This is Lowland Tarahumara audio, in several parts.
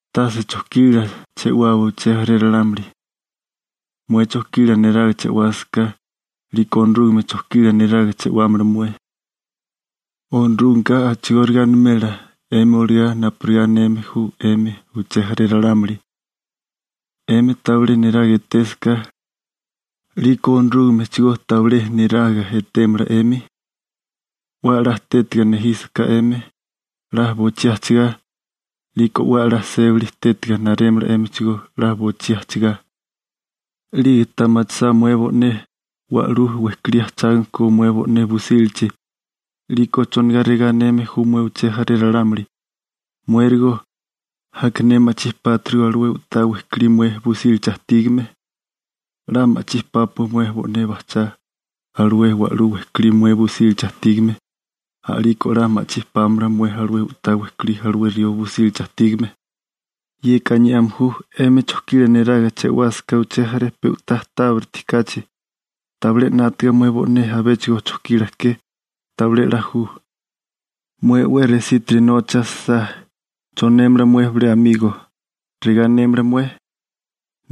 › Tase chojkila che'wawa uché jaré ralámuli. Mué chojkila neraga che'wásaká, 'liko Onorúgame chojkila neraga che'wámala mué. Onorúgameka a'chigóriga animela 'emi olagá napurigá aneme ju 'emi uché jaré ralámuli. 'Emi tabilé niraga etésaká, 'liko Onorúgamechigó tabilé niraga etémala 'emi. 'We a'lá tétaga nejísaká 'emi, 'la bochí ajchigá, 'liko 'we a'lá sébali tétiga narémala 'émichigó, 'la bochí ajchigá. 'Lige ta machisá mué bo'né wa'lú wejkolí ajchágame ko mué bo'né busílachi, 'liko ¿chonigá regá aneme ju mué uché jaré ralámuli: «Muérigo, aka ne ma'chí pátirigo alué u'tá wejkolí mué busílachi ajtígame.» 'La ma'chí pápua mué bo'né bajchá alué wa'lú wejkolí mué busílachi ajtígame, a'liko 'la ma'chí pámala mué alué u'tá wejkolí alué rió busílachi ajtígame. (Yeka aniame ju 'emi chojkila neraga che'wásaká uché jaré pe u'tá tábiriti kachi, tabilé 'nátaga mué bo'né abéchigo chojkila ke, tabilé 'la ju.) Mué 'we resítiri nocha asisá, ¿chonémala mué bilé amigo? ¿Regá anémala mué?: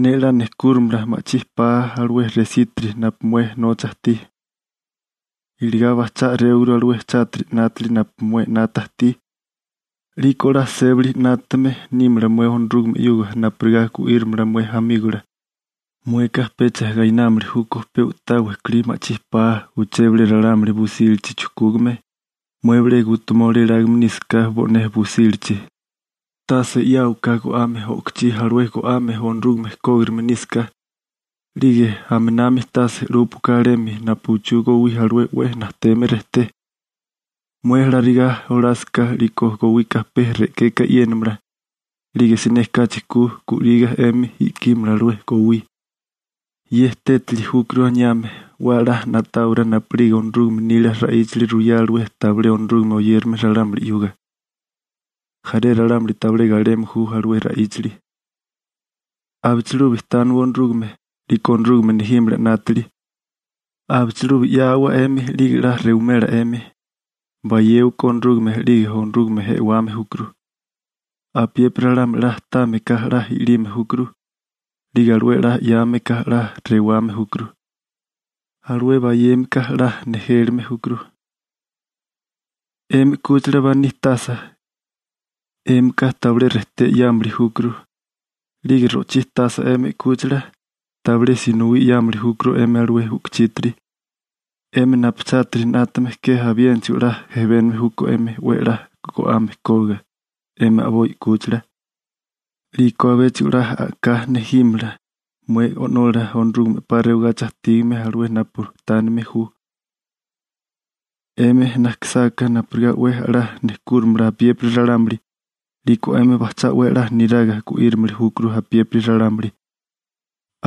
«Ne 'la nejkúrimala ma'chí paa alué resítiri napu mué nocha ajtí.» Iligá bajchá a'réwaguru alué chátiri 'nátili napu mué 'nata ajtí, 'liko 'la sébali 'nátame nímala mué Onorúgame 'yuga napurigá gu'írimala mué amígola. Mueka pecha gainámili júkó pe u'tá wejkolí ma'chí paa uché bilé ralámuli busílachi chujkúgame, mué bilé gutumoli elágame nísaká bo'né busílachi. › Tase 'yáwaká go'ame o'kochí alué go'ame Onorúgame kógirime nísaká. 'Lige aminami tase 'lúpuaká alemi napu uchú gowí alué 'we najteme rejté. Mué alarigá olásaká, 'liko gowika pe re'keka e'yénamala, 'lige siné kachi ku gu'liga 'emi i'kímala alué gowí. (Ye tétali júkuru aniame: 'We a'lá na'táwará napu'lige Onorúgame nila ra'íchali ruyá alué tabilé Onorúgame oyérame ralámuli 'yuga. Jaré ralámuli tabilé galeme ju alué ra'íchali.) › Abichilubi tániwa Onorúgame, 'liko Onorúgame nejímala 'nátili. Abichilubi 'yáawa 'emi 'lige 'la rewimela 'emi. Bayéwaká Onorúgame 'lige Onorúgame e'wame júkuru. Apiépiri ralámuli 'la támeká 'la i'lime júkuru. 'Lige alué 'la 'yáameká 'la rewame júkuru. Alué bayémeka 'la nejélime júkuru. › 'Emi 'kúchila baní tasa, 'émika tabilé rejté 'yámili júkuru. 'Lige ro'chí tasa 'emi 'kúchila, tabilé sinowí 'yámili júkuru 'emi alué u'kuchítiri. 'Emi napu chátiri 'nátame ke abiénachigo 'la jebénigame júkó 'emi 'we a'lá go'ame kógiga 'emi a'boi 'kúchila. 'Liko abéchigo 'la a'ká nejímala mué O'nola Onorúgame 'pa rewagachi ajtígame alué napu tánime ju. › 'Emi najkisáká napurigá 'we a'lá nejkúrimala apiépiri ralámuli, 'liko 'emi bajchá 'we a'lá niraga gu'írimili júkuru apiépiri ralámuli.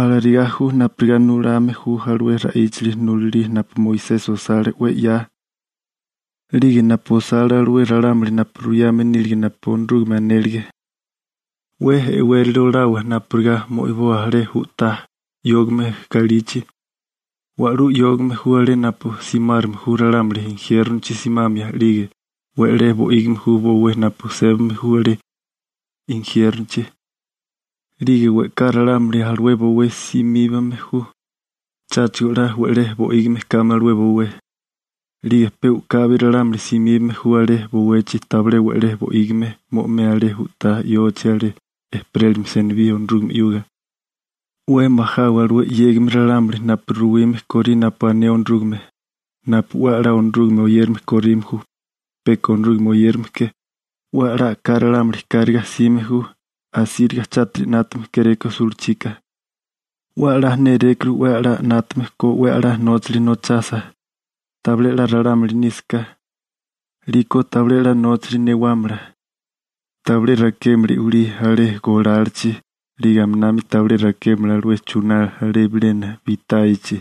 Alarigá ju napurigá nulame ju alué ra'íchali nulalí napu Moisesi osale 'we 'ya 'lige napu osale alué ralámuli napu ruyame nílige napu Onorúgame anélige. › 'We e'wérali olawa napurigá mo'iboa alé u'tá yógame galichi. Wa'lú yógame ju alé napu simárame ju ralámuli injiérnochi simamia 'lige we'lé bo'ígime ju bowé napu sébame alé injiérnochi, 'lige we'ká ralámuli alué bowé simíbame ju, cháchigo 'la we'lé bo'ígime kame alué bowé. 'Lige pe u'kabi ralámuli simíbame ju alé bowechi tabilé we'lé bo'ígime mo'imea alé u'tá yochi alé ejperélimia senibí Onorúgame 'yuga. › 'We majawa alué 'yégame ralámuli napu ruwime korí napu ané Onorúgame napu 'we a'lá Onorúgame oyérame korime ju, peka Onorúgame oyérame ke. 'We a'lá a'ká ralámuli kárigá jsime ju, asíriga chátiri 'nátame kéréko sulachika. 'We a'lá nérékuru 'we a'lá 'nátame ko 'we a'lá nóchali nochasa. Tabilé 'la ralámuli nísaká, 'liko tabilé 'la nóchali newámala. Tabilé rakémala i'wilí ('uba) alé golalachi, 'lige aminami tabilé rakémala alué chuná alé bilena bitáyachi.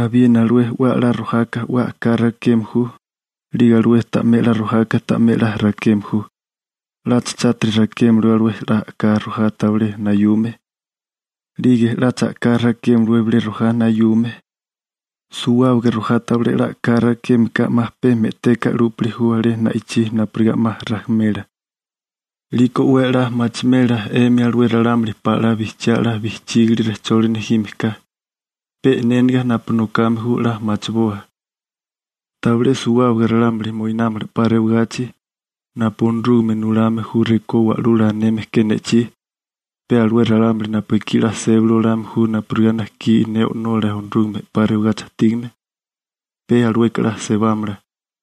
Abiena alué 'we a'lá rojaka 'we a'ká rakeme ju, 'lige alué ta'mé 'la rojaka ta'mé 'la rakeme ju. 'Lacha chátiri rakémalawé alué 'la a'ká rojá tabilé nayume, 'lige 'lacha a'ká rakémalawé bilé rojá nayume. Suwábaga rojá tabilé 'la a'ká rakémeka 'ma pe me'teka 'lúpili ju alé na'ichí napurigá 'ma rajimela. 'Liko 'we a'lá machimela 'emi alué ralámuli pala 'la bijchiá 'la bijchígili rejcholi nejime ka. Pe e'néniga napu nokame ju 'la machiboa. › Tabilé suwábaga ralámuli moinámala 'pa rewagachi napu Onorúgame nulame ju rekó Wa'lula aneme ke ne'chí. Pe alué ralámuli napu ekí 'la sébali olame ju napurigá najkí ne O'nola Onorúgame 'pa rewagachi ajtígame, pe alueka 'la sebámala.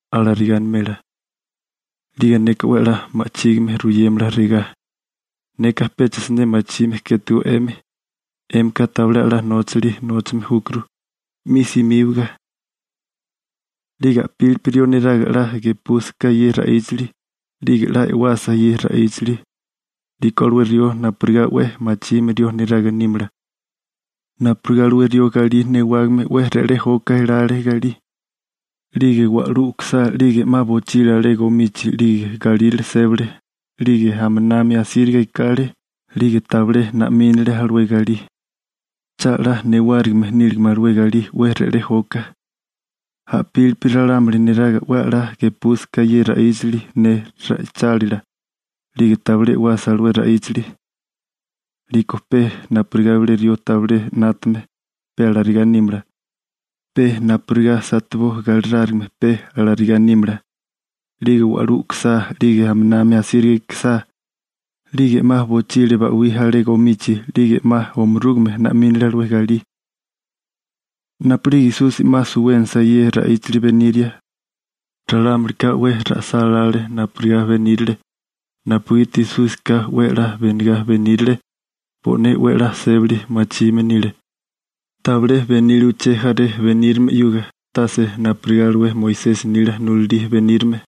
Alarigá animela. 'Lige neka 'we a'lá ma'chígime ruyémala regá: «Neka pecha siné machime kétego 'emi. 'Émika tabilé a'lá nóchali nóchame júkuru. 'Mi simíbaga.» › 'Lige a'pílipi rió neraga 'la gepúsaká ye ra'íchali, 'lige 'la e'wasa ye ra'íchali, 'liko alué rió napurigá 'we machime rió neraga nímala, napurigá alué rió galí newágame 'we re'lé joka elale galí. 'Lige wa'lú u'kusá 'lige 'ma bochile alé gomichi 'lige galírale sébale, 'lige aminami asíriga ekale, 'lige tabilé na'mínale alué galí, cha 'la newárigime níligame alué galí 'we re'lé joka. A'pili ralámuli neraga 'we a'lá gepúsaká ye ra'íchali ne ra'ichálila, 'lige tabilé e'wasa alué ra'íchali, 'liko pe napurigá bilé rió tabilé 'nátame, pe alarigá nímala, pe napurigá bilé galí satebó galirárigime pe alarigá nímala. 'Lige wa'lú u'kusá 'lige aminami asíriga ekesá, 'lige 'ma bochile ba'wí alé gomichi, 'lige 'ma omarúgame na'mínale alué galí. Napu'lige Esusi 'ma suwénasa ye ra'íchali beniria, ralámulika 'we ra'sálále napurigá benírale napugiti Esúsika 'we a'lá benigá benírale, bo'né 'we a'lá sébali machime nile, tabilé benile uché jaré benírame 'yuga, tase napurigá alué Moisesi nila nulalí benírame.